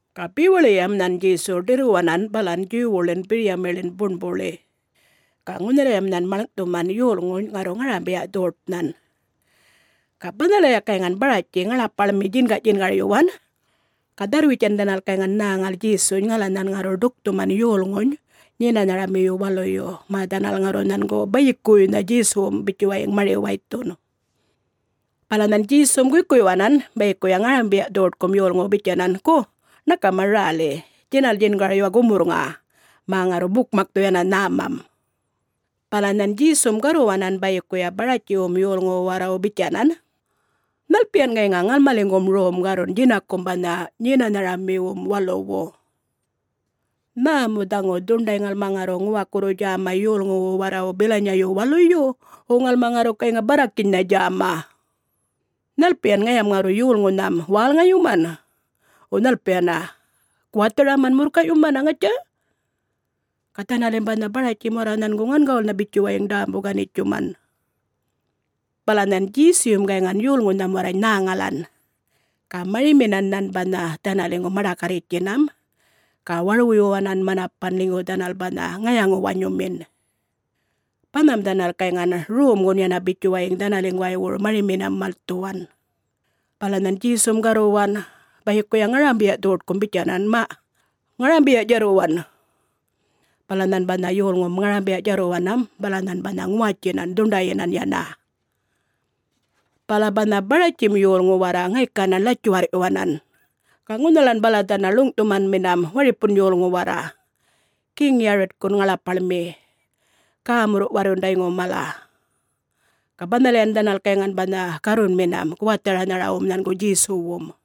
Ga bewaḻiyam nhan Djesu ḏirruwanan balan Djuwwuḻin biryamiḻin buṉbuḻi. Ga ŋunhalayam nhan maḻŋꞌthuman yolŋuny ŋarru ŋarambiya-dhoṯnhan. Ga banhalaya gayŋan Baratji ŋaḻapaḻmi djingaꞌdjingaryuwan ga dharr-witjan dhanal gayŋan nhäŋal Djesuny ŋala nhan ŋarru ḏukthuman yolŋuny Nyenanharamiyu Waluy mä dhanal ŋarru nhangu bayikuwuynha Djesuwum bitjuwayiŋ mari-waythun. Bala nhan Djesum guykuyuwanan bayikuya ŋarambiya-dhoṯkum yolŋuwu bitjanan, “Gu ṉakama räli, djinal djingaryuwa gumurrŋa, mä ŋarru bukmakthu yana nhämam.” Bala nhan Djesum garruwanan bayikuya Baratjiwum yolŋuwu warrawu bitjanan, “Nhalpiyan gayŋa ŋalmaliŋgum romma garrun djinakum banha Nyenanharamiwum Waluwu? Nhä mu dhaŋu dhuṉḏay ŋalma ŋarru ŋuwakurru djäma yolŋuwu warrawu bilanyayu waluyu, wo ŋalma ŋarru gayŋa barrakinynha djäma? Nhalpiyan ŋayam ŋarru yolŋunham wälŋayuman, wo nhalpiyana guwatharaman murrkay'yumana, ŋatja?” Ga dhanalim banha Baratjim warra nhangu ŋangawulnha bitjuwayiŋ ḏämbu-ganitjuman. Bala nhan Djesuyum gayŋan yolŋunham warrany nhäŋalan, ga mariminan nhan banha dhanaliŋgu maḏakarritjtjinam ga warwuyuwanan manapan ḻinygu dhanal banha ŋayaŋu-wanyumin. Banham dhanal gayŋan romgun yana bitjuwayiŋ dhanaliŋguwaywuru mariminam malthuwan. Bala nhan Djesum garruwan bayikuya ŋarambiya-dhoṯkum bitjanan, “Maꞌ ŋarambiya djarruwan!” Bala nhan banha yolŋum ŋarambiya djarruwanam bala nhan banha ŋuwatjinan dhuṉḏayyinan yana. Bala banha Baratjim yolŋu warra ŋaykanan ḻatjuwarrꞌyuwanan, ga ŋunhalan bala dhanal ḻuŋꞌthumanminam waripun yolŋu warra, Geŋ-Yaritkun ŋaḻapaḻmi gämurruꞌ-warrundayŋun mala. Ga banhalayan dhanal gayŋan banha garrunminam guwatharanharawum nhangu Djesuwum.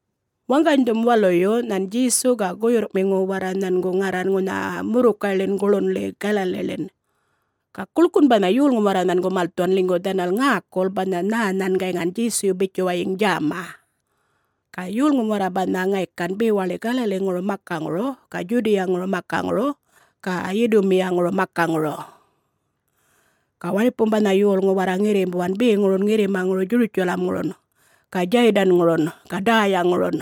Waŋganydhum waluyu nhan Djesu ga guyurrꞌmiŋu warra nhangu ŋarran ŋunha murrukayḻin guḻunꞌli Galaliḻin. Ga guḻkun banha yolŋum warra nhangu malthuwan ḻinygu dhanal ŋäkul banha nhä nhan gayŋan Djesuyu bitjuwayiŋ djäma. Ga yolŋum warra banha ŋaykan bewaḻi Galaliŋuru makaŋuru ga Djudiyaŋuru makaŋuru ga Yidumiyaŋuru makaŋuru. Ga waripum banha yolŋu warra ŋirrimbuwan beŋurun ŋirrimaŋuru Djurutjalamŋurun ga Djaydanŋurun ga Däyaŋurun.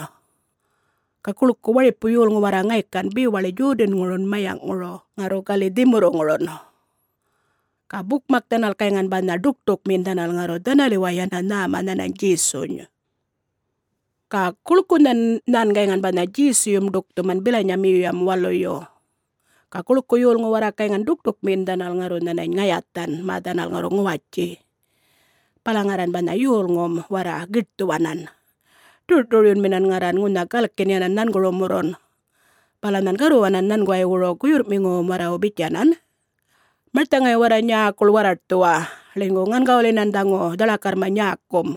Ga guḻku waripu yolŋu warra ŋaykan bewaḻi Djodanŋurun mayaŋꞌŋuru ŋarru gali dhimurruŋurun. Ga bukmak dhanal gayŋan banha ḏukṯukmiyin dhanal ŋarru dhanaliway yana nhäma nhanany Djesuny. Ga guḻkunhan nhan gayŋan banha Djesuyum ḏukthuman bilanyamiyuyam waluyu, ga guḻku yolŋu warra gayŋan ḏukṯukmiyin dhanal ŋarru nhanany ŋayathan, mä dhanal ŋarru ŋuwatji. Bala ŋarran banha yolŋum warra giṯthuwanan, ḏurꞌṯuryunminan ŋarran ŋunha galkin yanan nhangurumurrun, bala nhan garruwanan nhanguwaywuru guyurrꞌmiŋuwum warrawu bitjanan, “Marthaŋay warra nyäkuḻ warraṯthuwa, ḻinygu ŋangawulyinan dhaŋu dhaḻakarrma nyäkum.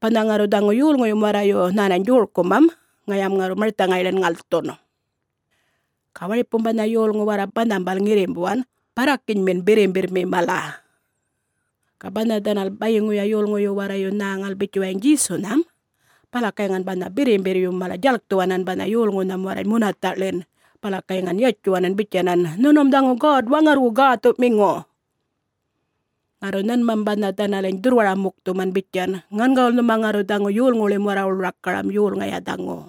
Banha ŋarru dhaŋu yolŋuyum warrayu nhänany djorkumam, ŋayam ŋarru marthaŋayḻin ŋalthun.” Ga waripum banha yolŋu warra banhambal ŋirrimbuwan barrakinymin birrimbirrmi mala. Ga banha dhanal bayiŋuya yolŋuyu warrayu nhäŋal bitjuwayiŋ Djesunham, bala gayŋan banha birrimbirryum mala djalkthuwanan banha yolŋunham warrany munathaꞌḻin bala gayŋan yatjuwanan bitjanan, “Nhunum dhaŋu God-Waŋarrwu Gäthuꞌmiŋu.” Ŋarru nhanmam banha dhanaliny dhurrwara-mukthuman bitjan, “Ŋangawul nhuma ŋarru dhaŋu yolŋuwuḻim warrawuḻ rakaram, yol Ŋaya dhaŋu!”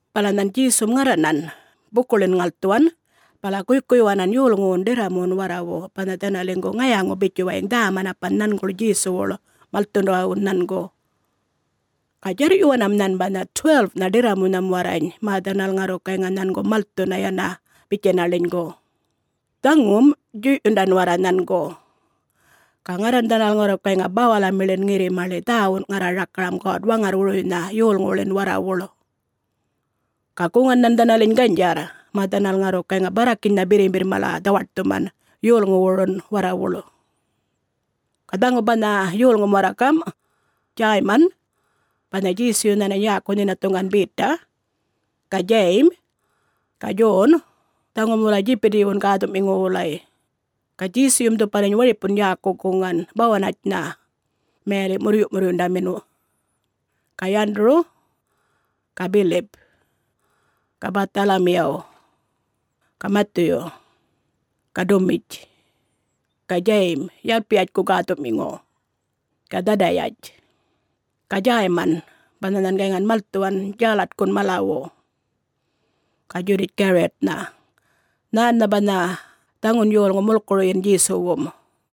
Bala nhan Djesum ŋarranan bukuḻin ŋalthuwan bala guykuyyuwanan yolŋuwun ḏirramuwun warrawu banha dhanaliŋgu ŋayaŋu bitjuwayiŋ dhä-manapan nhanguḻ Djesuwuḻ, malthundawun nhangu. Ga djarrꞌyuwanam nhan banha 12-nha ḏirramunham warrany mä dhanal ŋarru gayŋa nhangu malthuna yana bitjana ḻinygu, dhaŋum djuyꞌyundan warra nhangu. Ga ŋarran dhanal ŋarru gayŋa bawalamiḻin ŋirrimaḻi dhäwun ŋarra rakaram God-Waŋarrwuruynha yolŋuwuḻin warrawuḻ. Ga guŋan nhan dhanaliny ganydjarr, mä dhanal ŋarru gayŋa barrakinynha birrimbirr mala dhawaṯthuman yolŋuwurun warrawuḻ. Ga dhaŋu banha yolŋum warra gamꞌ: Djäyman (banha Djesuyu nhanany yäku nhinathuŋgan Beta) ga Djayim ga Djon, dhaŋum wulay Djipitiwun gäthuꞌmiŋu wulay. (Ga Djesuyum dhupaliny waripun yäku guŋan, ‘Bawanatjitjnha’ mayaliꞌ ‘Murryuꞌmurryundamin’.) ga Yanduru ga Bilip ga Bäthalamiyaw ga Mathuyu ga Dumitj ga Djayim (Yalpiyatjku gäthuꞌmiŋu) ga Dhadayatj ga Djäyman, (banha nhan gayŋan malthuwan Djalatkun malawu) ga Djudatj Gariyatnha (nhännha banha dhaŋun yolŋu mulkuruyin Djesuwum.)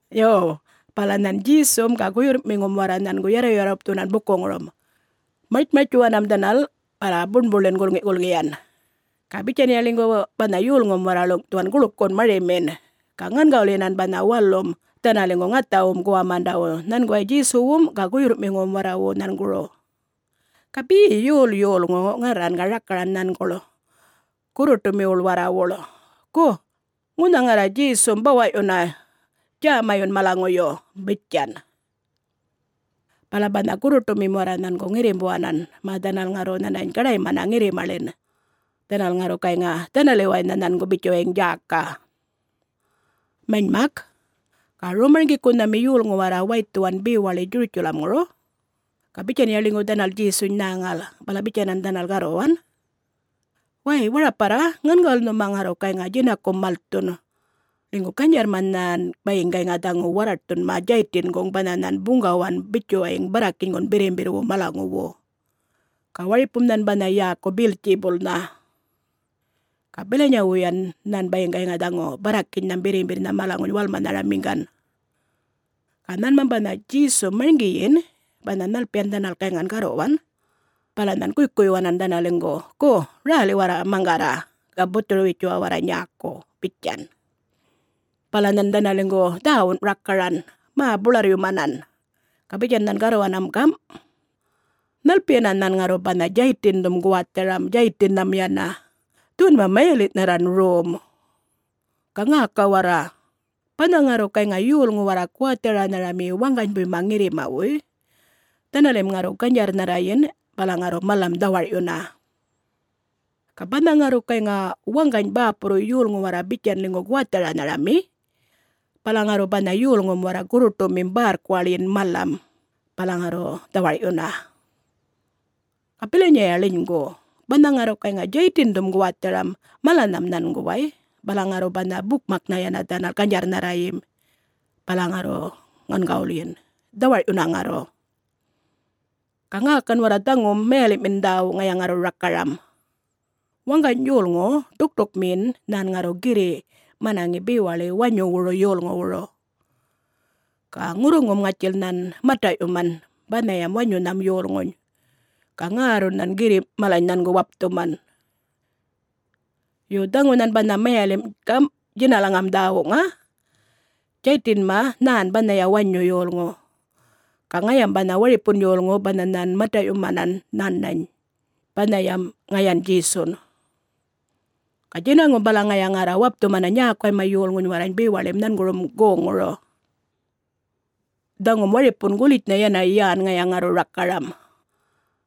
Yo, bala nhan Djesum ga guyurrꞌmiŋum warra nhangu yarruyarrupthuwanan bukuŋurum. Martjmartjtjuwanam dhanal bala buṉbuḻin gulŋiꞌ-gulŋiyan. Ga bitjanya ḻinygu banha yolŋum warra ḻuŋꞌthuwan guḻkun marimin, ga ŋangawulyinan banha walum dhanaliŋgu ŋathawum guwamandawu nhanguway Djesuwum ga guyurrꞌmiŋuwum warrawu nhanguru. Ga be yol yolŋu ŋarran ga rakaran nhanguḻ gurruṯumiwuḻ warrawuḻ, “Gu ŋunha ŋarra Djesum bawaꞌyuna, djämayun, malaŋuyu!” bitjan. Bala banha gurruṯumim warra nhangu ŋirrimbuwanan mä dhanal ŋarru nhanany gaḏaymana ŋirrimaḻin. Dhanal ŋarru gayŋa dhanaliwaynha nhangu bitjuwayiŋ djäka. Manymak, ga rom-marŋgikunhami yolŋu warra waythuwan bewaḻi Djurutjalamŋuru ga bitjanya ḻinygu dhanal Djesuny nhäŋal, bala bitjanan dhanal garruwan, “Way, waraparra, ŋangawul nhuma ŋarru gayŋa djinakum malthun, ḻinygu ganydjarrma nhan bayiŋ gayŋa dhaŋu warraṯthunma Djaytinguŋ banha nhan buŋgawan bitjuwayiŋ barrakinygun birrimbirrwu malaŋuwu, ga waripum nhan banha yäku Beltjibulnha. Ga bilanyawuyan nhan bayiŋ gayŋa dhaŋu barrakinynham birrimbirrnha malaŋuny walmaranhamiŋgan.” Ga nhanmam banha Djesum marŋgiyin banha nhalpiyan dhanal gayŋan garruwan, bala nhan guykuyyuwanan dhanaliŋgu, “Gu, räli warra maŋgarra ga buthuru-witjuwa warra nyäku,” bitjan. Bala nhan dhanaliŋgu dhäwun rakaran mä buḻarryumanan. Ga bitjan nhan garruwanam gamꞌ, “Nhalpiyana nhan ŋarru banha Djaytindhum guwatharam Djaytinnham yana? Dhuwanma mayaliꞌnharran rom. Ga ŋäka warra! Banha ŋarru gayŋa yolŋu warra guwatharanharami waŋganybuyma ŋirrimawuy, dhanalim ŋarru ganydjarrnharrayin bala ŋarru malam dhawarꞌyuna. Ga banha ŋarru gayŋa waŋgany bäpurru yolŋu warra bitjan ḻinygu guwatharanharami, bala ŋarru banha yolŋum warra gurruṯumim bärrkuwaḻyin malam, bala ŋarru dhawarꞌyuna. Ga bilanyaya ḻinygu, banha ŋarru gayŋa Djaytindhum guwatharam malanham nhanguway, bala ŋarru banha bukmaknha yana dhanal ganydjarrnharriyim bala ŋarru ŋangawulyin, dhawarꞌyuna ŋarru! Ga ŋäkan warra dhaŋum mayaliꞌmin dhäwu ŋaya ŋarru rakaram: Waŋgany yolŋu ḏukṯukmiyin nhan ŋarru girriꞌ manaŋi bewaḻi wanyuwuru yolŋuwuru. Ga ŋurruŋum ŋatjil nhan mataꞌyuman banhayam wanyunham yolŋuny, ga ŋärrun nhan girrimꞌ malany nhangu wapthuman. [Yo, dhaŋu nhan banha mayalimꞌ gamꞌ djinalaŋam dhäwuŋa: Djaytinma, nhän banhaya wanyu yolŋu, ga ŋayam banha waripun yolŋu banha nhan mataꞌyumanan nhanany, banhayam ŋayan Djesun. Ga djinaŋum bala ŋaya ŋarra wapthumana nyäkuwayma yolŋuny warrany bewaḻim nhangurum goŋŋuru.] Dhaŋum waripun gulitjnha yana yän ŋaya ŋarru rakaram: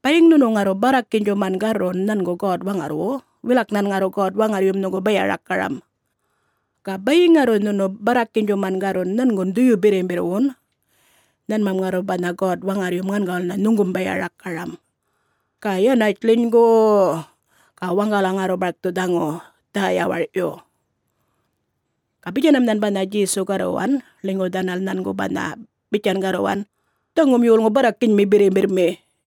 Bayiŋ nhunu ŋarru barrakinydjuman garrun nhangu God-Waŋarrwu, wilak nhan ŋarru God-Waŋarryum nhuŋgu baya-rakaram. Ga bayiŋ ŋarru nhunu barrakinydjuman garrun nhangun Dhuyu-Birrimbirrwun, nhanmam ŋarru banha God-Waŋarryum ŋangawulnha nhuŋgum baya-rakaram, ga yanatj ḻinygu-u-u ga waŋgala ŋarru barkthu dhaŋu dhä-yawarꞌyu!” Ga bitjanam nhan banha Djesu garruwan ḻinygu dhanal nhangu banha bitjan garruwan, “Dhaŋum yolŋu barrakinymi birrimbirrmi.”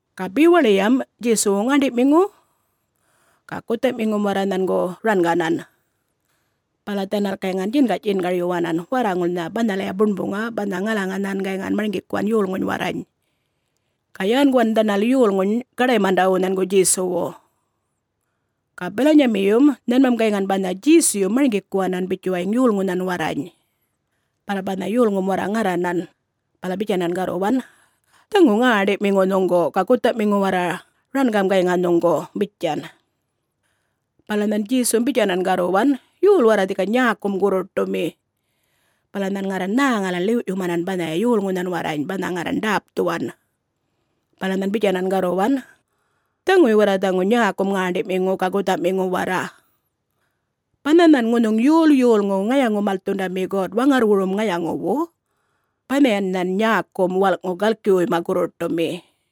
Ga bewaḻiyam Djesuwu ŋäṉḏiꞌmiŋum ga guthaꞌmiŋum warra nhangu ranganan. Bala dhanal gayŋan djingaꞌ-djingaryuwanan warraŋulnha banhalaya buṉbuŋa banha ŋalaŋa nhan gayŋan marŋgikuwan yolŋuny warrany. Ga yänguwan dhanal yolŋuny gaḏaymandawu nhangu Djesuwu. Ga bilanyamiyum nhanmam gayŋan banha Djesuyum marŋgikuwanan bitjuwayiŋ yolŋunhan warrany. Bala banha yolŋum ŋarranan, bala bitjanan garruwan, “Dhaŋu ŋäṉḏiꞌmiŋu nhuŋgu ga guthaꞌmiŋu warra rangam gayŋa nhuŋgu,” bitjan. Bala nhan Djesum bitjanan garruwan, “Yol warra dhika nyäkum gurruṯumi?” Bala nhan ŋarran nhäŋalan ḻiwꞌyumanan banhaya yolŋunhan warrany banha ŋarran ḏäpthuwan. Bala nhan bitjanan garruwan, “Dhaŋuy warra dhaŋu nyäkum ŋäṉḏiꞌmiŋu ga guthaꞌmiŋu warra. Banha nhan ŋunhuŋ yol yolŋu ŋayaŋu-malthundami God-Waŋarrwurum ŋayaŋuwu, banhayan nhan nyäkum walꞌŋu galkiwuyma gurruṯumi.”